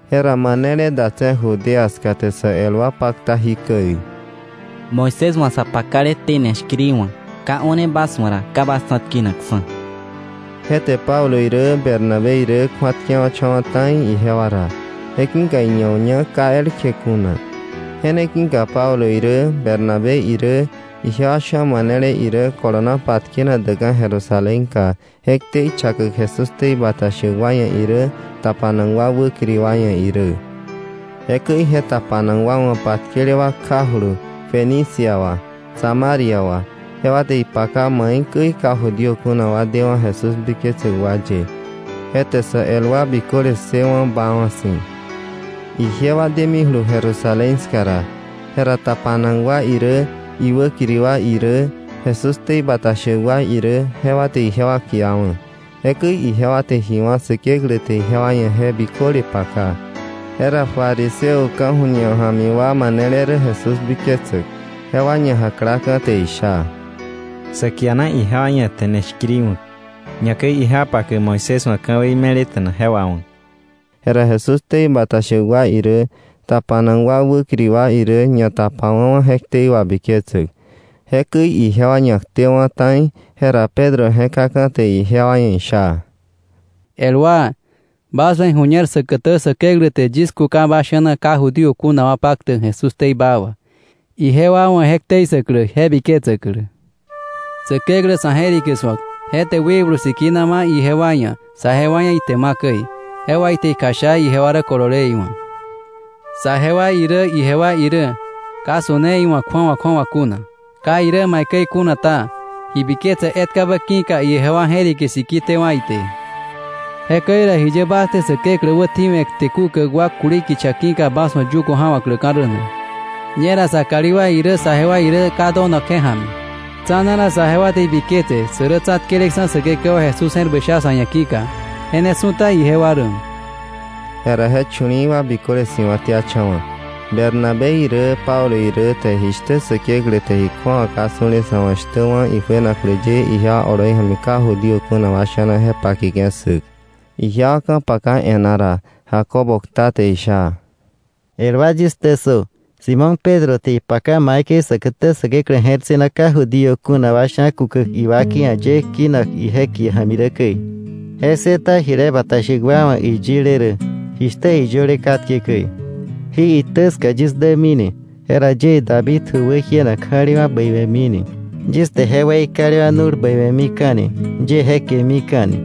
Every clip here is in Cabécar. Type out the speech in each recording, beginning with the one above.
Jera manele datse̱ Judea ska te sä el wa pakta, “Moisés wa̱ sa pakale tene shkiri wa̱k ka o̱ne bas wa̱ ra, ka bas tsa̱tkenakksa̱.” Je te Pablo irä Bernabé irä kju̱atkewa̱cha̱wa̱ ta̱i ijewa ra, je ki̱ iña uña ka elkje kuna. Je ne ki̱ka Pablo irä Bernabé irä ijewa sha̱ manele irä kolona patkenak däkka̱ Jerusalénka je ktei chakäk Jesús ktei bata shäk wa ia̱ irä tapanak wa wäkiri wa ia̱ irä. Jekäi je tapanak wa wa̱ patkele wa kjajulu Fenicia wa, Samaria wa, jewa te ipaka maikäi ka Judío kuna wa dewa̱ Jesús biketsäk wa ye. Je te sä el wa biköle ssëwa̱ baawa̱ si̱. Ijewa demijulu Jerusalén ska ra, jera tapanak wa irä iwäkiri wa irä Jesús ktei bata shäk wa irä jewa te ijewa kiawa̱. Jekäi ijewa te ji wá̱ Säkeklä te ijewa ia̱ je biköle paka. Jera fariseo ka̱ju̱ñe ja̱mi wa manele rä Jesús biketsäk jewa ñajaklaka̱ te isha: —Sa kiana ijewa ia̱ tene shkiri wa̱k, ñakäi ijewa pakäk Moisés wa̱ ka̱wei me̱leta̱na je wawa̱k. Jera Jesús ktei bata shäk wa irä, tapanak wa wäkiri wa irä ñatapawa̱wa̱ je ktei wabiketsäk. Jekäi ijewa ñaktewa̱ ta̱i, jera Pedro je̱kaka̱ te ijewa ia̱ isha: —El wa, bas wa̱ iju̱ñer säkätä Säkeklä te yis kuka bas sha̱na ka Judío kuna wa paktäk Jesús ktei baa wà, ijewa wa̱ je ktei ssäklä, je biketsäklä. Säkeklä sa̱ je̱rike su̱ak, je te Wikblu Sikina ma̱ ijewa ia̱, saje wa ia̱ ite ima̱ käi. Je wà ite ikjasha ijewa rä kolole iwa̱. Saje wa irä, ijewa irä ka su̱ne iwa̱ kju̱awa kju̱awa kuna. Ka irä maikäi kuna ta, ji biketse etkabä ki̱ka ijewa je̱rike siki tewa̱ ite. Jekäi ra, ¿jiye bas te Säkeklä wätjiwe̱ kte kukäk wa kuli kicha ki̱ka bas wa̱ yugo ja̱wa̱kläka̱ rä na? Ñera sa kalí wa irä saje wa irä ka donak je ja̱mi. Tsa̱na ra saje wa te ibiketse sä rä tsa̱tkeleksa̱ Säkekewa Jesús je̱r bäi sha sa̱ ia̱ ki̱ka, je ne su̱ta ijewa rä. Jera je chu̱li̱i̱ wa biköle si̱wa̱tiacha̱wa̱, Bernabé irä Pablo irä te jishtä Säkeklä te ji kju̱awa ka su̱le sa̱ wa̱ shtä wá̱ ijuenaklä ye ijewa oloi ja̱mi ka Judío kuna wa sha̱na je pakeke̱ ssäk. Ijewa ka̱paka e̱ná ra, Jacobo kta te isha: —El wa, yis ktä ssö. Simón Pedro te ipaka maikäi säkätä Säkeklä je̱r ssëna ka Judío kuna wa sha̱ kukäk iwakei ia̱ ye kinak ije kie ja̱mi rä käi. Je ssëta jile bata shäk wa wa̱ iyile rä, jishtä iyöle katke käi: ‘Jí itä ska yis dämini. Jera yie David ju wäjienak ja̱lewa̱ bäiwe̱mini. Yis te je weikalewa̱ nu̱l bäiwe̱mika̱ni, yie je kemika̱ni.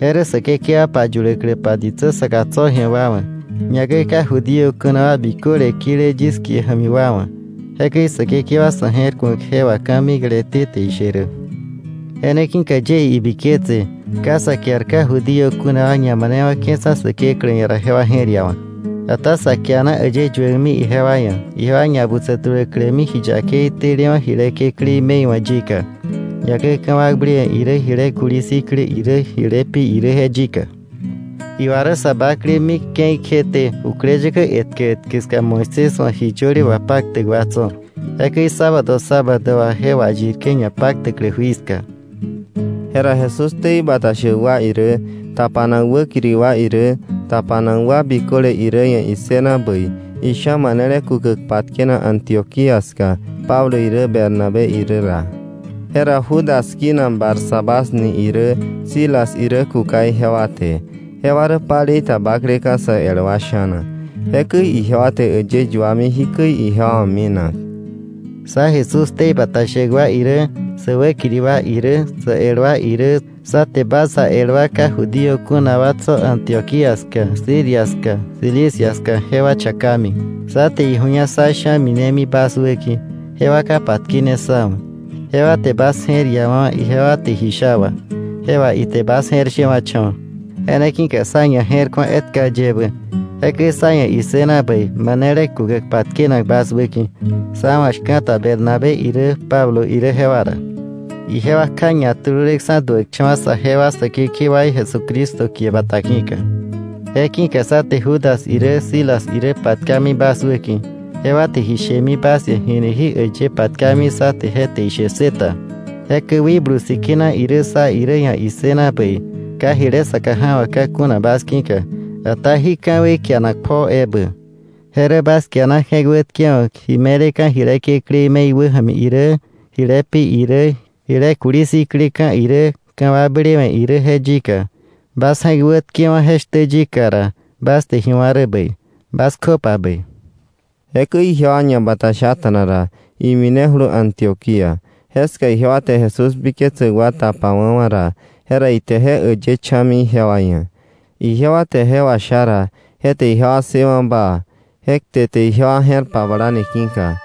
Je rä Säkekewa payuläkläpa ditsä saka tso̱ ji̱a wa wa̱, ñakäi ka Judío kuna wa biköle kile yis kie ja̱mi wa wa̱. Jekäi Säkekewa sa̱ je̱rku̱ak je wà ka̱mikleté te ishe rä.’ “Je ne ki̱ka yie ibiketse ka sa kiar ka Judío kuna wa ñamanewa̱ke̱ksa̱ Säkeklä ia̱ ra jewa je̱r iawa̱k. Ata sa kiana äyë yuäkmi ijewa ia̱ ijewa ñabutsä tuläklämi ji yakei telewa̱ jile kekläí me̱i wa̱ yika, ñakäi ka̱wakblewe̱ irä, jile kuli sikleka̱ irä, jile pi irä, je yika. Iwa rä sa bakle mik ke̱i kjeté jukläyäkä etkä etkä ska Moisés wa̱ ji yöle wapaktäk wa tso̱, jekäi sábado sábado wà je wayirke̱ ñapaktäklä jui ska. Jera Jesús ktei bata shäk wa irä, tapanak wäkiri wa irä, tapanak wa biköle irä ia̱ issëna bäi isha̱ manele kukäk patkenak Antioquía ska Pablo irä Bernabé irä ra. Jera Judas kinak Barsabás ni irä, Silas irä kuka ijewa te. Jewa rä palei ta bakleka̱ sä el wa sha̱na. Jekäi ijewa te äyë yuami jikäi ijewa wa̱ minak: “Sá Jesús ktei bata shäk wa irä, sä wäkiri wa irä, sä el wa irä, sá te bas sá el wa ka Judío kuna wa tso̱ Antioquía ska, Siria ska, Cilicia ska jewa chakami. Sá te iju̱ña sá sha̱ minemi bas wäki̱, jewa ka patkene sá wa̱. Jewa te bas je̱r iawa̱wa̱ ijewa te ji sha wà, je wà ite bas je̱r shewa̱cha̱wa̱. Je ne ki̱ka sá ñaje̱rku̱a etka yebä, jekäi sá ia̱ issëna bäi manele kukäk patkenak bas wäki̱, sá wa̱ shka̱ta Bernabé irä Pablo irä jewa ra. Ijewa kja ñatululeksa̱ duäkcha̱wa̱ saje wa Säkekewaí Jesucristo kie bata ki̱ka. Je ki̱ka sá te Judas irä Silas irä patkami bas wäki̱, jewa te ji shemi bas ia̱ jini jí äyë patkami sá te je te ishe ssë ta. Jekäi Wikblu Sikina irä sá irä ia̱ issëna bäi, ka jile saka ja̱wa̱kka̱ kuna bas ki̱ka, ata jí ka̱wei kianak pjoo ebä: Je rä bas kiana je̱k wätkewa̱k ji me̱leka̱ jile kekläí me̱i wäja̱mi irä, jile pi irä, jile kuli sikleka̱ irä, ka̱wakblewe̱ irä je yika. Bas je̱k wätkewa̱ je shtä yika ra, bas te ji wá̱ rä bäi. Bas kjöpa bäi.” Jekäi ijewa ñabatashata̱na ra, iminejulu Antioquía, jeska ijewa te Jesús biketsäk wa tapawa̱wa̱ ra, jera ite je äyë cha̱mi ijewa ia̱. Ijewa te je washa ra, je te ijewa ssëwa̱ baa, je kte te ijewa je̱r pablani ki̱ka.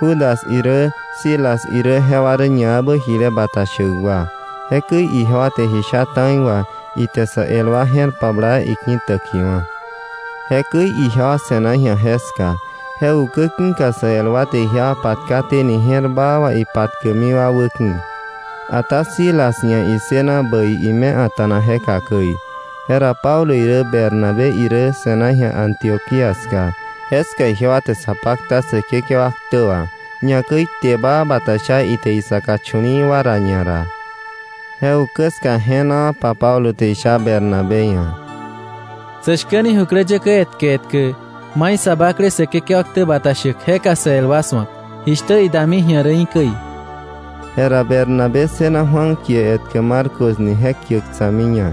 Judas irä Silas irä jewa rä ñaebä jile bata shäk wa. Jekäi ijewa te ji sha ta̱i wà, ite sä el wa je̱r pabla, iki̱täkiwa̱. Jekäi ijewa se̱na ji̱a jeska. Je ukä ki̱ka sä el wa te ijewa patkaténi je̱r baa wà ipatkäkmi wa wä ki̱. Ata Silas ia̱ issëna bäi ime a̱ta̱na jeka käi. Jera Pablo irä Bernabé irä se̱na ji̱a Antioquía ska. Jeska ijewa te sa pakta Säkekewa ktä wà, ñakäi kte baa bata sha ite isaka chu̱li̱i̱ wa ra ñara. Je ukä ska je̱naapa Pablo te isha Bernabé ia̱: —Sä shkäni jukläyäkä etkä etkä mai sa bakle Säkekewa ktä bata shäk jeka sä el wa su̱ak, jishtä idami ji̱a rä í̱ käi. Jera Bernabé ssëna Juan kie etkä Marcos ni je kiäk tsa̱miña.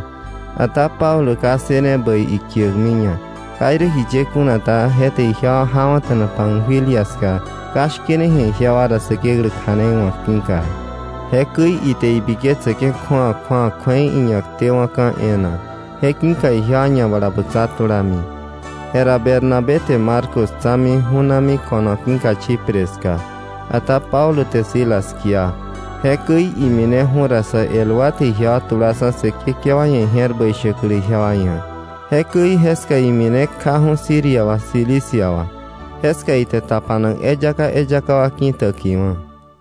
Ata Pablo ka ssëne bäi ikiäkmiña. Ka irä jiye kuna ta, je te ijewa jawa̱ta̱na Panfilia ska ka shkene ji̱a ijewa ra Säkeklä kja̱nei wa̱k ki̱ka. Jekäi ka ijewa ia̱ ibiketsar etkabä ki̱ka ijewa ñabalabutsa tulami. Jera Bernabé te Marcos tsa̱mi, ju̱nami ko̱no ki̱ka Chipre ska. Ata Pablo te Silas kia. Jekäi imineju̱ ra sä el wa te ijewa tulaksa̱ Säkekewa ia̱ ije̱r bäi shäklä ijewa ia̱. Jekäi jeska imine kjaju̱ Siria wa, Cilicia wa. Jeska ite tapanak eyaka eyaka wa ki̱täkiwa̱.